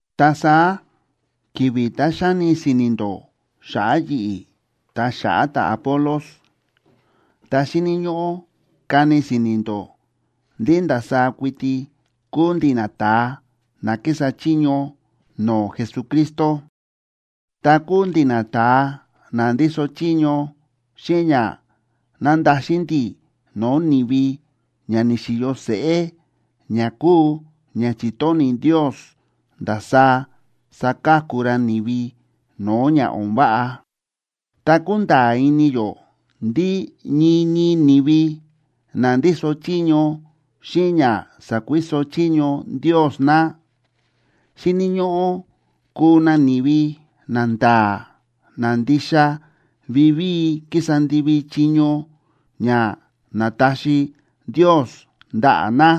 Ta saá ki̱vi̱ tá xáni si̱ni̱ ndó xa̱ꞌa̱ yi̱ꞌi̱ ta xa̱ꞌa̱ ta̱Apolos, ta xíni̱ ñóꞌó kani si̱ni̱ ndó ndí ndasaá kuiti kúu ndi̱ nata̱a na kísa chiño no̱o̱ Jesucristo, ta kúu ndi̱ nata̱a na ndíso chiño xíꞌin ña nándaxin ndi̱ no̱o̱ ni̱vi ña ni̱xi̱yo seꞌé, ña kúu ña chi̱tóni̱ Ndios ndasaá saka̱ku ra ni̱vi no̱o̱ ña o̱n váꞌa. Ta kúnda̱a̱ ini yó ndí ñii ñii ni̱vi na ndíso chiño xíꞌin ña sa̱kuiso chiño Ndios na, xíni̱ ñóꞌó kuu na ni̱vi nanda̱a̱ na ndixa vivíi kísa ndivi chiño ña na̱taxi Ndios ndaꞌa̱ na.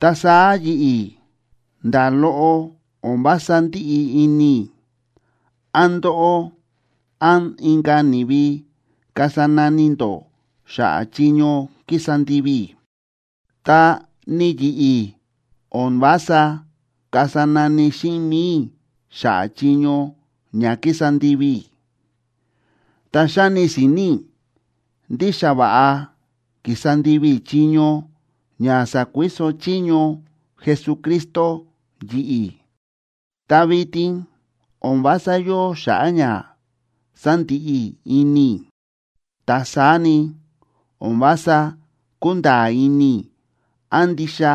Ta saá yi̱ꞌi̱, nda̱ loꞌo o̱n vása ndíꞌi ini i̱ án ndóꞌó án inka̱ ni̱vi kasa nani ndó xa̱ꞌa̱ chiño ki̱sa ndivi i̱. Ta ni yi̱ꞌi̱, o̱n vása kasa nani xíꞌin mi̱i i̱ xa̱ꞌa̱ chiño ña ki̱sa ndivi i̱. Ta xáni si̱ni̱ i̱ ndí xa va̱ꞌa ki̱sa ndivi i̱ chiño ña sa̱kuiso chiño Jesucristo yi̱ꞌi̱, ta vitin o̱n vása yóo xa̱ꞌa̱ ña sandiꞌi ini i̱. Ta saá ni, o̱n vása kúnda̱a̱ ini i̱ án ndixa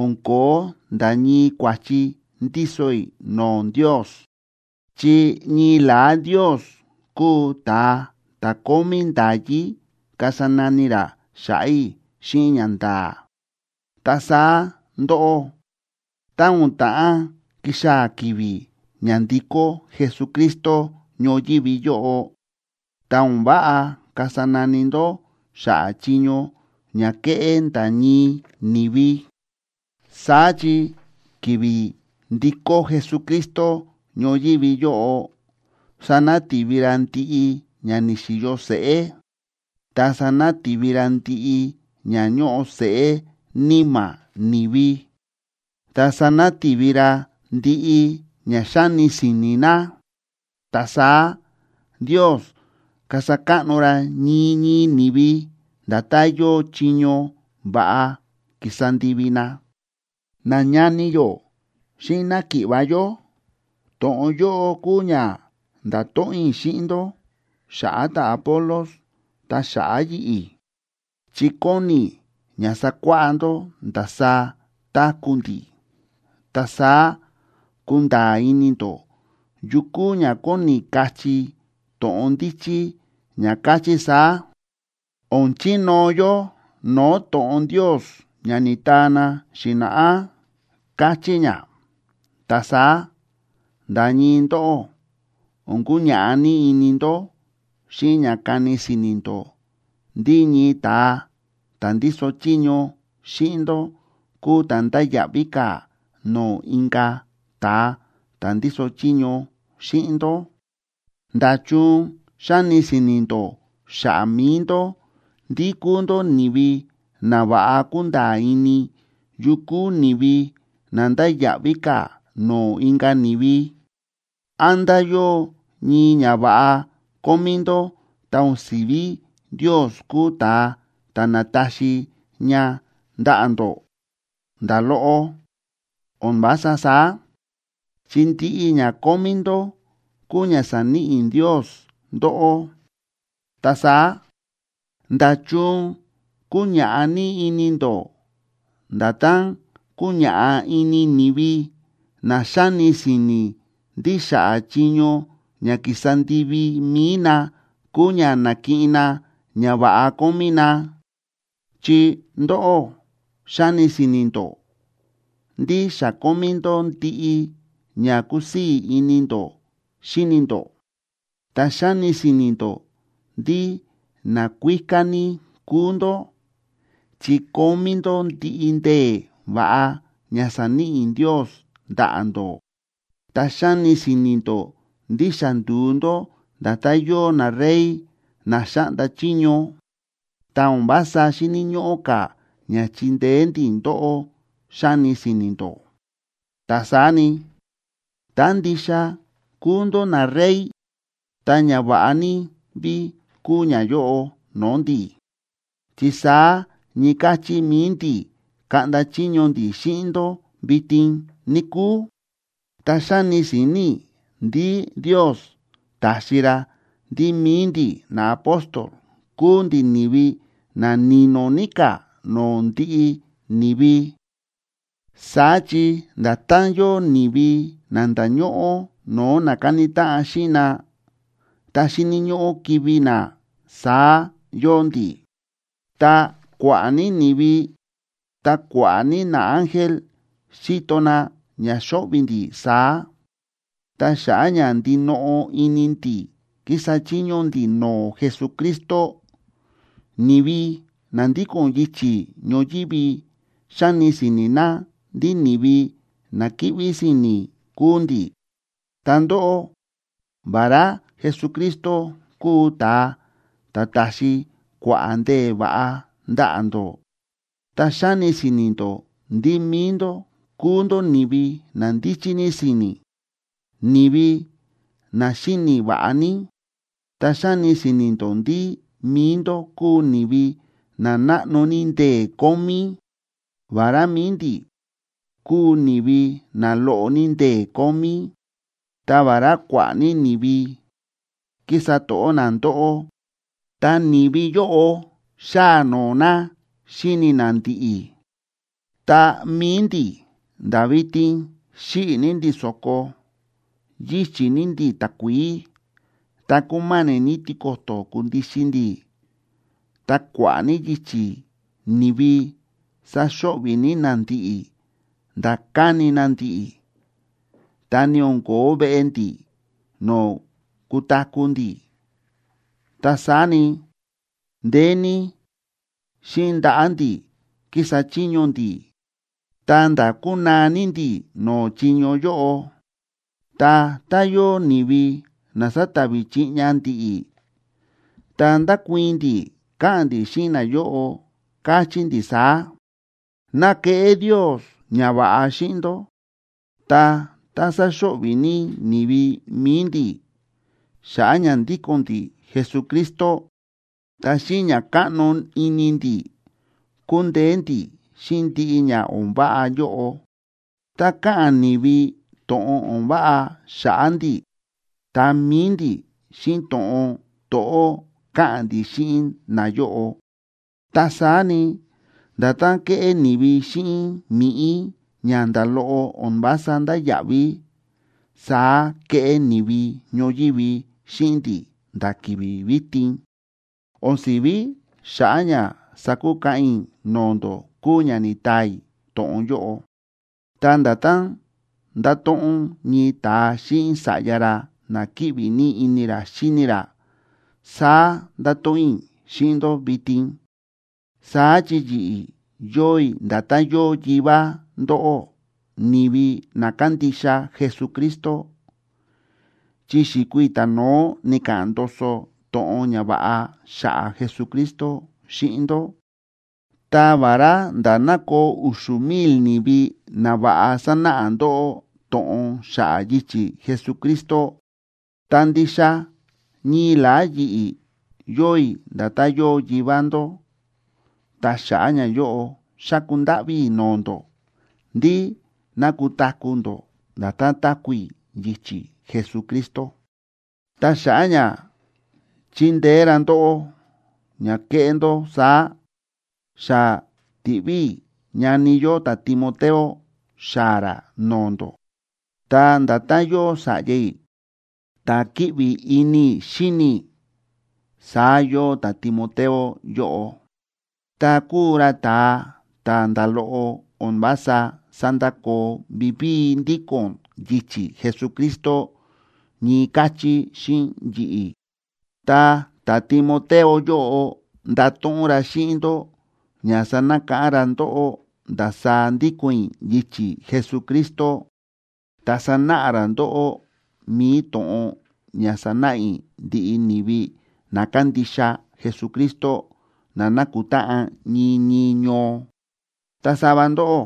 o̱n ko̱ó nda̱ ñii kua̱chi ndíso i̱ no̱o̱ Ndios, chi ñii la̱á Ndios kúu ta̱a ta̱ kómí nda̱yí kasa nani ra xa̱ꞌa̱ i̱ xíꞌin ñanda̱a̱. Ta saá ndóꞌó, tá o̱n ta̱ꞌán kixaa̱ ki̱vi̱ ña ndikó Jesucristo ñoyívi yóꞌo, ta o̱n váꞌa kasa nani ndó xa̱ꞌa̱ chiño ña ke̱ꞌé nda̱ ñii ni̱vi. Saá chi ki̱vi̱ ndikó Jesucristo ñoyívi yóꞌo, sanati̱vi ra ndiꞌi ña ni̱xi̱yo seꞌé, ta sanati̱vi ra ndiꞌi ña ñóꞌo seꞌé níma̱ ni̱vi, ta sanati̱vi ra ndiꞌi ña xáni si̱ni̱ na. Ta saá Ndios kasa káꞌno ra ñii ñii ni̱vi nda̱tán yóo chiño va̱ꞌa ki̱sa ndivi na. Nañani yó xíꞌin náki̱ꞌva̱ yó, to̱ꞌon yóꞌo kúu ña nda̱to̱ꞌon i̱ xíꞌin ndó xa̱ꞌa̱ ta̱Apolos ta xa̱ꞌa̱ yi̱ꞌi̱, chi kóni i̱ ña sakuáꞌá ndó ndasaá táku̱ ndi̱. Ta saá kunda̱a̱ ini ndó yu kúu ña kóni kachí to̱ꞌon ndíchí ña káchí saá: “O̱n chinóo yó no̱o̱ to̱ꞌon Ndios ña ni̱taa na xi̱na̱ꞌá”, káchí ña. Ta saá nda̱ ñii ndóꞌó o̱n kuñaꞌá ní ini ndó xíꞌin ña kani si̱ni̱ ndó ndí ñii ta̱a ta̱ ndíso chiño xíꞌin ndó kúu ta̱ ndáya̱ꞌví ka̱ no̱o̱ inka̱ ta̱a ta̱ ndíso chiño xíꞌin ndó. ¿Nda̱chun xáni si̱ni̱ ndó xa̱ꞌa̱ mi̱i ndó ndí kúu ndó ni̱vi na va̱ꞌa kúnda̱a̱ ini yu kúu ni̱vi na ndáya̱ꞌví ka̱ no̱o̱ inka̱ ni̱vi? ¿Án nda̱ yóo ñii ñava̱ꞌa kómí ndó tá o̱n si̱ví Ndios kúu ta̱a ta̱ na̱taxi ña ndaꞌa̱ ndó? Nda̱ loꞌo, o̱n vása saá. Chi ndiꞌi ña kómí ndó kúu ña sa̱níꞌi Ndios ndóꞌó. Ta saá, ¿nda̱chun kúñaꞌá ní ini ndó nda̱tán kúñaꞌá ini ni̱vi na xáni si̱ni̱ ndí xa̱ꞌa̱ chiño ña ki̱sa ndivi mi̱i na kúu ña na̱kiꞌin na ñava̱ꞌa kómí na? Chi ndóꞌó xáni si̱ni̱ ndó ndí xa kómí ndó ndiꞌi ña kúsii̱ ini ndó xíni ndó, ta xáni si̱ni̱ ndó ndí nakuíká ní kúu ndó chi kómí ndó ndiꞌi ndee̱ va̱ꞌa ña sa̱níꞌi Ndios ndaꞌa̱ ndó. Ta xáni si̱ni̱ ndó ndí xa ndu̱u ndó nda̱tán yóo narey na xáꞌnda chiño, ta o̱n vása xíni̱ ñóꞌó ka̱ ña chindeé ndi̱ ndóꞌó, xáni si̱ni̱ ndó. Ta saá ni, tá ndixa kuu ndó narey, ta ñava̱ꞌa ní ví kuu ñayóꞌo no̱o̱ ndi̱. Chi saá ñii káchí mi̱i ndi̱ kaꞌnda chiño ndi̱ xíꞌin ndó vitin, níkúu. Ta xáni si̱ni̱ i̱ ndí Ndios ta̱xi ra ndí mi̱i ndi̱ naapóstol kúu ndi̱ ni̱vi na ni̱no̱ ní ka̱ no̱o̱ ndiꞌi ni̱vi. Saá chi nda̱tán yóo ni̱vi na nda̱ñóꞌó no̱o̱ na káni táꞌan xíꞌin na, ta xíni̱ ñóꞌó kivi̱ na, saá yóo ndi̱. Ta kua̱ꞌa̱ ní ni̱vi ta kua̱ꞌa̱ ní naángel, xíto na ña xóꞌvi̱ ndi̱ saá. Ta xa̱ꞌa̱ ña ndinoꞌo ini ndi̱ kísa chiño ndi̱ no̱o̱ Jesucristo, ni̱vi na ndíko̱n yichi̱ ñoyívi xáni si̱ni̱ na ndí ni̱vi na kíꞌví si̱ni̱ kúu ndi̱. Ta ndóꞌó, vará Jesucristo kúu ta̱a ta̱ ta̱xi kua̱ꞌa̱ ndee̱ va̱ꞌa ndaꞌa̱ ndó, ta xáni si̱ni̱ ndó ndí mi̱i ndó kúu ndó ni̱vi na ndíchí ní si̱ni̱, ni̱vi na xíni̱ va̱ꞌa ní. Ta xáni si̱ni̱ ndó ndí mi̱i ndó kúu ni̱vi na náꞌno ní ndee̱ kómí, vará mi̱i ndi̱ kúu ni̱vi na loꞌo ní ndee̱ kómí. Ta vará kua̱ꞌa̱ ní ni̱vi kísa to̱ꞌó na ndóꞌó, ta ni̱vi yóꞌo xáa noo na xíni na ndi̱ꞌi̱. Ta mi̱i ndi̱, nda̱ vitin xíꞌi̱ ní ndi̱ so̱ko, yíchi̱ ní ndi̱ takuií, ta kúma̱ni̱ ní tiko̱to̱ kundixin ndi̱. Ta kua̱ꞌa̱ ní yichi̱ ni̱vi sáxo̱ꞌvi̱ ní na ndi̱ꞌi̱ nda̱ káni na ndi̱ꞌi̱, ta ni o̱n ko̱ó veꞌe ndi̱ no̱o̱ kutaku̱ ndi̱. Ta saá ni, ndeé ní xíꞌin ndaꞌa̱ ndi̱ kísa chiño ndi̱, ta̱nda̱ kúnaa ní ndi̱ no̱o̱ chiño yóꞌo. Ta tá yóo ni̱vi na sátavi chiꞌña ndi̱ꞌi̱, ta ndákuii̱n ndi̱ káꞌa̱n ndi̱ xíꞌin nayóꞌo, káchí ndi̱ saá: “Ná keꞌé Ndios ñava̱ꞌa xíꞌin ndó.” Ta tá sáxo̱ꞌvi̱ ní ni̱vi mi̱i ndi̱ xa̱ꞌa̱ ña ndíko̱n ndi̱ Jesucristo, ta xíꞌin ña káꞌno ini ndi̱ kúndeé ndi̱ xíꞌin ndiꞌi ña o̱n váꞌa yóꞌo. Tá káꞌa̱n ni̱vi to̱ꞌon o̱n váꞌa xa̱ꞌa̱ ndi̱, ta mi̱i ndi̱, xíꞌin to̱ꞌon to̱ꞌó káꞌa̱n ndi̱ xíꞌin nayóꞌo. Ta saá ni, nda̱tán kéꞌé ni̱vi xíꞌin mi̱ꞌí ña nda̱ loꞌo o̱n vása ndáya̱ꞌví, saá kéꞌé ni̱vi ñoyívi xíꞌin ndi̱ nda̱ ki̱vi̱ vitin. O̱n si̱ví xa̱ꞌa̱ ña sakukaꞌan i̱ no̱o̱ ndó kúu ña ni̱taa i̱ to̱ꞌon yóꞌo. Ta nda̱tán ndáto̱ꞌon ñii ta̱a xíꞌin sa̱ꞌya ra na kíꞌvi ní ini ra xíni ra, saá ndáto̱ꞌon i̱ xíꞌin ndó vitin. Saá chi yi̱ꞌi̱, yóo i̱ nda̱tán yóo yivá ndóꞌó, ni̱vi na kándixa Jesucristo, chi xi̱kuu i̱ ta̱no̱ó ni̱ka̱ꞌa̱n ndoso to̱ꞌon ñava̱ꞌa xa̱ꞌa̱ Jesucristo xíꞌin ndó. Ta vará nda̱ ná koo u̱xu̱ mil ni̱vi na va̱ꞌa sánáꞌa ndóꞌó to̱ꞌon xa̱ꞌa̱ yichi̱ Jesucristo, ta ndixa ñii la̱á yi̱ꞌi̱ yóo i̱ nda̱tán yóo yivá ndó. Ta xa̱ꞌa̱ ñayóꞌo, xáku ndáꞌví i̱ no̱o̱ ndó ndí ná kutaku̱ ndó nda̱tán táku̱ i̱ yichi̱ Jesucristo. Ta xa̱ꞌa̱ ña chindeé ra ndóꞌó ña keꞌé ndó saá, xa ti̱ꞌví i̱ ñani yó ta̱Timoteo xaa̱ ra no̱o̱ ndó. Ta nda̱tán yóo sa̱ꞌya i̱ ta̱ kíꞌvi ini i̱ xíni i̱, saá yóo ta̱Timoteo yóꞌo. Ta kúu ra ta̱a ta̱ nda̱ loꞌo o̱n vása sándakoo vivíi ndíko̱n yichi̱ Jesucristo ñii káchí xíꞌin yi̱ꞌi̱. Ta ta̱Timoteo yóꞌo ndato̱ꞌon ra xíꞌin ndó ña sanakáꞌán ra ndóꞌó ndasaá ndíko̱n i̱ yichi̱ Jesucristo, ta sanáꞌa ra ndóꞌó mi̱i to̱ꞌon ña sánáꞌa i̱ ndiꞌi ni̱vi na kándixa Jesucristo, na nákutáꞌan ñii ñii ñoo. Ta sava ndóꞌó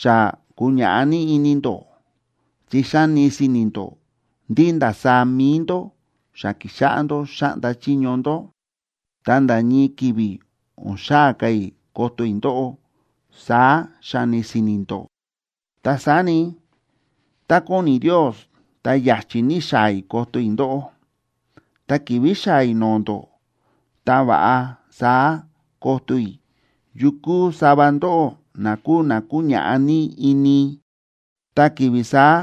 xa kúñaꞌá ní ini ndó, chi xáni si̱ni̱ ndó ndí ndasaá mi̱i ndó xa ki̱xáꞌá ndó xáꞌnda chiño ndó, ta nda̱ ñii ki̱vi̱ o̱n xaa̱ ka̱ i̱ koto i̱ ndóꞌó, saá xáni si̱ni̱ ndó. Ta saá ni, tá kóni Ndios, ta ya̱chi̱ ní xaa̱ i̱ koto i̱ ndóꞌó. Tá ki̱vi̱ xaa̱ i̱ no̱o̱ ndó, ta va̱ꞌa saá koto i̱ yu kúu sava ndóꞌó na kúu na kúñaꞌá ní ini. Ta ki̱vi̱ saá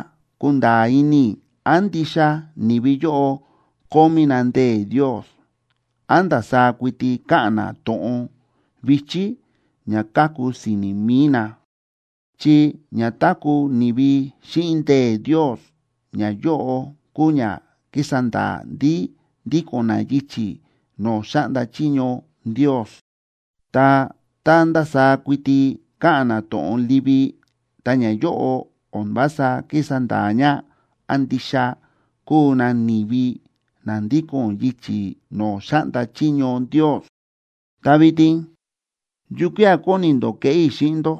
kunda̱a̱ ini i̱ án ndixa ni̱vi yóꞌo kómí na ndee̱ Ndios, án ndasaá kuiti káꞌa̱n na to̱ꞌon vi̱chí ña káku si̱ni̱ mi̱i na. Chi ña táku̱ ni̱vi xíꞌin ndee̱ Ndios, ñayóꞌo kúu ña kísa nda̱a̱ ndí ndíko̱n na yichi̱ no̱o̱ xáꞌnda chiño Ndios. Ta tá ndasaá kuiti káꞌa̱n na to̱ꞌon livi, ta ñayóꞌo o̱n vása kísa nda̱a̱ ña án ndixa kúu na ni̱vi na ndíko̱n yichi̱ no̱o̱ xáꞌnda chiño Ndios. Ta vitin, ¿yukía̱ kóni ndó keꞌé i̱ xíꞌin ndó?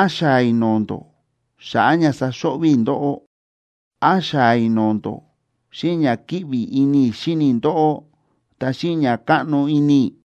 ¿Án xaa̱ i̱ no̱o̱ ndó xa̱ꞌa̱ ña saxo̱ꞌvi̱ i̱ ndóꞌó? ¿Án xaa̱ i̱ no̱o̱ ndó xíꞌin ña kíꞌvi ini i̱ xíni i̱ ndóꞌó, ta xíꞌin ña káꞌno ini i̱?